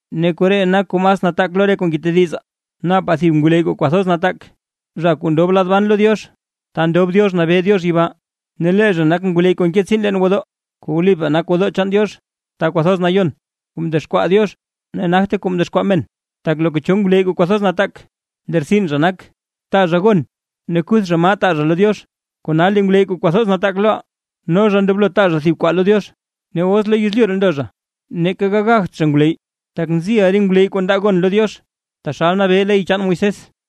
Ne koree nak kuu mas nataak lo re kuu ngetedizaa: Napaa thib ngwleyy kuu kwathoz nataak, zha kuu ndob lab ban lo Diox, ta ndob Diox nabee Diox yibaa. Ne lee zha nak ngwleyy kuu nke tsiin leen gwodoo kuu wlipaa nak gwodoo chaan Diox Ta Kwathoz Nayon, kuu mdexkwaa Diox ne nagte kuu mdexkwaa men. Tak loka cho ngwleyy kuu kwathoz nataak, lee rtsin zha nak, taa zha gon ne kuth zha maa taa zha lo Diox, kona lee ngwleyy kuu kwathoz nataak loʼaa, no zha ndoblo taa zha thib kwaa lo Diox. Ne os lo yezlyu ree ndo zha, neeka gagagt zha ngwleyy, tak nziʼa re ngwleyy kuu ndaa gon lo Diox taxal nabee ley chaan Moisés.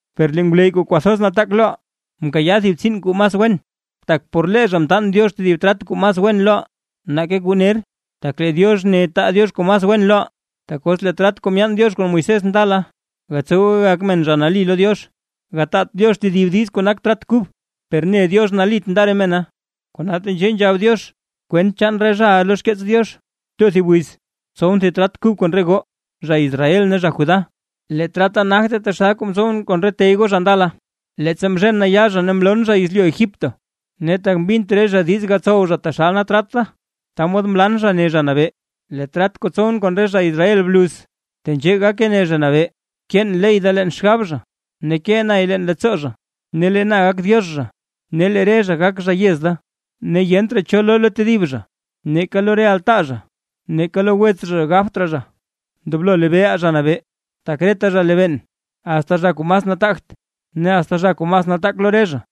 Per lee ngwleyy kuu kwathoz nataak loʼaa, mkayaa thib tsiin kuu mas wen, tak por lee zha mtaan Diox tedib trat kuu mas wen loʼaa, nake kuu ner, tak lee Diox ne taa Diox kuu mas wen loʼaa. Tak os lee trat kuu myaan Diox kon Moisés ndala, gatsowe gagak men zha nali lo Diox, gataat Diox tedib diiz kuu nak trat kub. Per ne Diox nalit nda re mena, kona tenzhee nzhab Diox kwent chaan re zhaʼa lo xkeets Diox: Too thib wiz, tsowʼn thib trat kub kon re goo, zha Israel ne zha Judá. Lee trata nagte taxal kuu mtsowʼn kon re tey goo zha ndala, leettsa mzhen na yaa zha ne mloon zha yezlyu Egipto; ne tak mbint re zha diiz gatsow taxal nak trat da, ta mod mlan zha, ne Zha Nabee. Lee trat kuu tsowʼn kon re zha Israel bluz, tenzhee gake ne Zha Nabee: Keen ley da leen xgab zha, ne kee nay leen leettsoo zha. Ne lee na gak Diox zha, ne lee re zha gak zha yez da. Ne yent raa cho loo lo tedib zha; neeka lo re altaa zha neeka lo wets zha gabt raa zha: “Ndoblo lebeeʼa Zha Nabee”, tak reta zha lebeen, asta zha kuu mas nataagt ne asta zha kuu mas nataak lo re zha.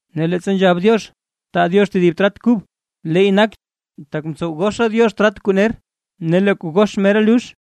Ne leettsa nzhab Diox: “Taa Diox tedib trat kub”, leey nak, tak mtsow goxa Diox trat kuu ner. Ne lee kuu gox mera lux.